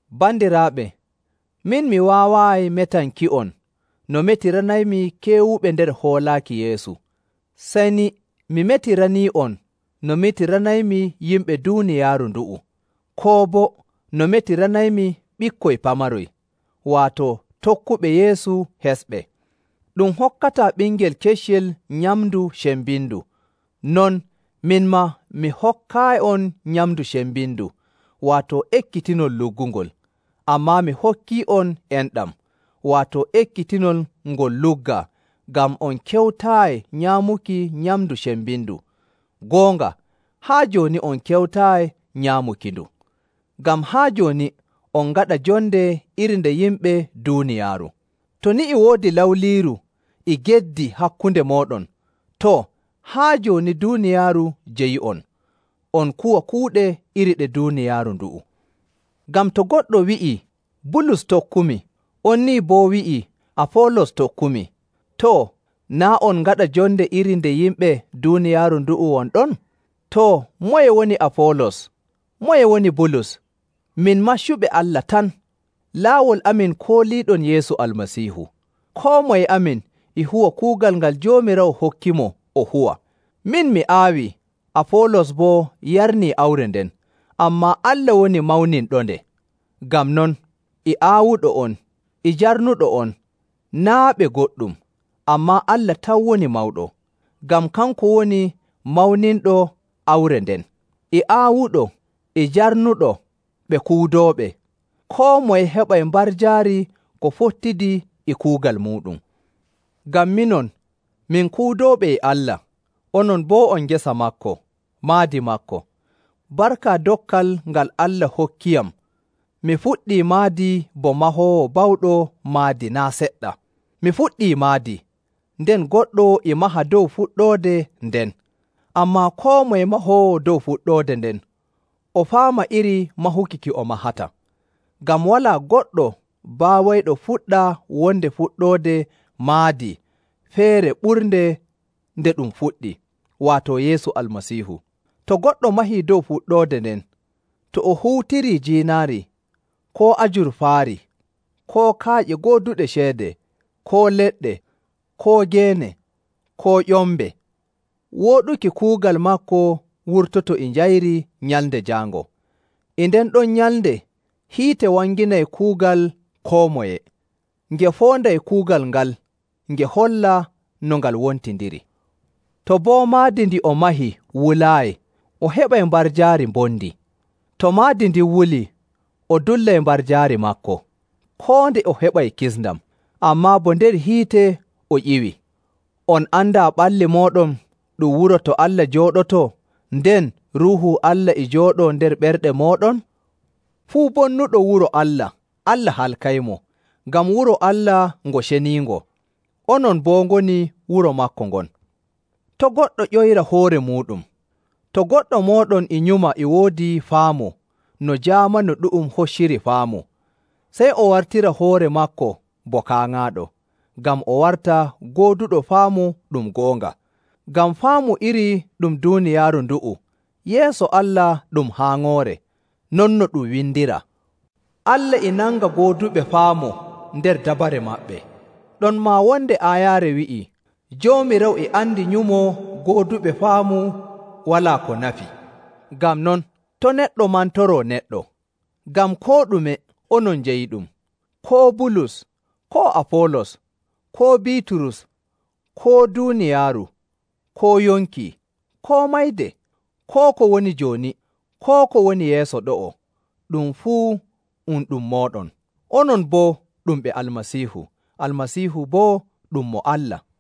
Bandiraaɓe, min mi waawaayi metanki'on no metiranaymi keewuɓe nder hoolaaki Yeesu. Sey ni mi metiranii'on no metiranaymi yimɓe duuniyaaru ndu'u, koo boo no metiranaymi ɓikkoy pamaroy, waato tokkuɓe Yeesu hesɓe. Ɗum hokkataa ɓingel keccel nyamndu cembindu. Non min maa mi hokkaayi'on nyamndu cembindu, waato ekkitinol luggungol. Ammaa mi hokkii'on enɗam, waato ekkitinol ngol luggaa ngam on kewtaayi nyaamuki nyamndu cembindu. Goonga, haa jooni on kewtaayi nyaamukindu. Ngam haa jooni on ngaɗa jonde iri nde yimɓe duuniyaaru. To ni e woodi lawliiru e geddi hakkunde mooɗon, too, haa jooni duuniyaaru jeyi'on, on kuwa kuuɗe iri ɗe duuniyaaru ndu'u. Ngam to goɗɗo wi'ii, “Bulus tokkumi,” on nii boo wi'ii, “Afoolos tokkumi,” too, naa' on ngaɗa jonde iri nde yimɓe duuniyaaru ndu'u won ɗon? Too, moye woni Afoolos? Moye woni Bulus? Min maccuɓe Allah tan. Laawol amin kooliiɗon Yeesu Almasiihu. Koo moye amin e huwa kuugal ngal Joomiraawo hokkimo o huwa. Min mi aawii, Afoolos boo yarnii awre nden, ammaa Allah woni mawninɗonde. Ngam non, e aawuɗo on e jarnuɗo on naa' ɓe goɗɗum, ammaa Allah tan woni mawɗo, ngam kanko woni mawninɗo awre nden. E aawuɗo e jarnuɗo ɓe kuudooɓe. Koo moye heɓay mbarjaari ko fottidi e kuugal muuɗum. Ngam minon, min kuudooɓe e Allah. Onon boo on ngesa maako, maadi maako. Barka dokkal ngal Allah hokkiyam, mi fuɗɗii maadi bo mahoowo bawɗo maadi naa' seɗɗa. Mi fuɗɗi maadii, nden goɗɗo e maha dow fuɗɗoode nden. Ammaa koo moye mahoowo dow fuɗɗoode nden o faama iri mahuki ki o mahata. Ngam walaa goɗɗo baawayɗo fuɗɗa wonde fuɗɗoode maadi feere ɓurnde nde ɗum fuɗɗi, waato Yeesu Almasiihu. To goɗɗo mahii dow fuɗɗoode nden, to o huutirii jiinaari, koo ajurfaari, koo kaaƴe gooduɗe ceede, koo leɗɗe, koo geene, koo ƴombe, wooɗuki kuugal maako wurtoto e njayri Nyalnde Jaango. E nden ɗon nyalnde hiite wanginay kuugal koo moye, nge foonday kuugal ngal nge holla no ngal wontindiri. To boo maadi ndi o mahi wulaayi, o heɓay mbarjaari mbondi. To maadi ndin wulii, o dullay mbarjaari maako, koo nde o heɓay kisndam, ammaa bo nder hiite o ƴiwi. On andaa ɓalli mooɗon ɗum wuro to Allah jooɗotoo, nden Ruuhu Allah e jooɗoo nder ɓerɗe mooɗon? Fuu bonnuɗo wuro Allah, Allah halkaymo. Ngam wuro Allah ngo ceniingo; onon boo ngoni wuro maako ngon. To' goɗɗo ƴoyra hoore muuɗum. To goɗɗo mooɗon e nyuma e woodi faamu no jaamanu ɗu'um hocciri faamu, sey o wartira hoore maako bo kaaŋaaɗo, ngam o warta gooduɗo faamu ɗum goonga. Ngam faamu iri ɗum duuniyaaru ndu'u, yeeso Allah ɗum haaŋoore. Non no ɗum windiraa, “Allah e nanga gooduɓe faamu nder dabare maɓɓe.” Ɗonmaa wonde aayaare wi'ii, “Joomiraawo e andi nyumo gooduɓe faamu walaa ko nafi.” Ngam non, to' neɗɗo mantoroo neɗɗo! Ngam koo ɗume onon njeyiɗum. Koo Bulus, koo Afoolos, koo Biiturus, koo duuniyaaru, koo yonki, koo mayde, koo ko woni jooni, koo ko woni yeeso ɗo'o, ɗum fuu um ɗum mooɗon. Onon boo ɗum ɓe Almasiihu. Almasiihu boo ɗum mo Allah.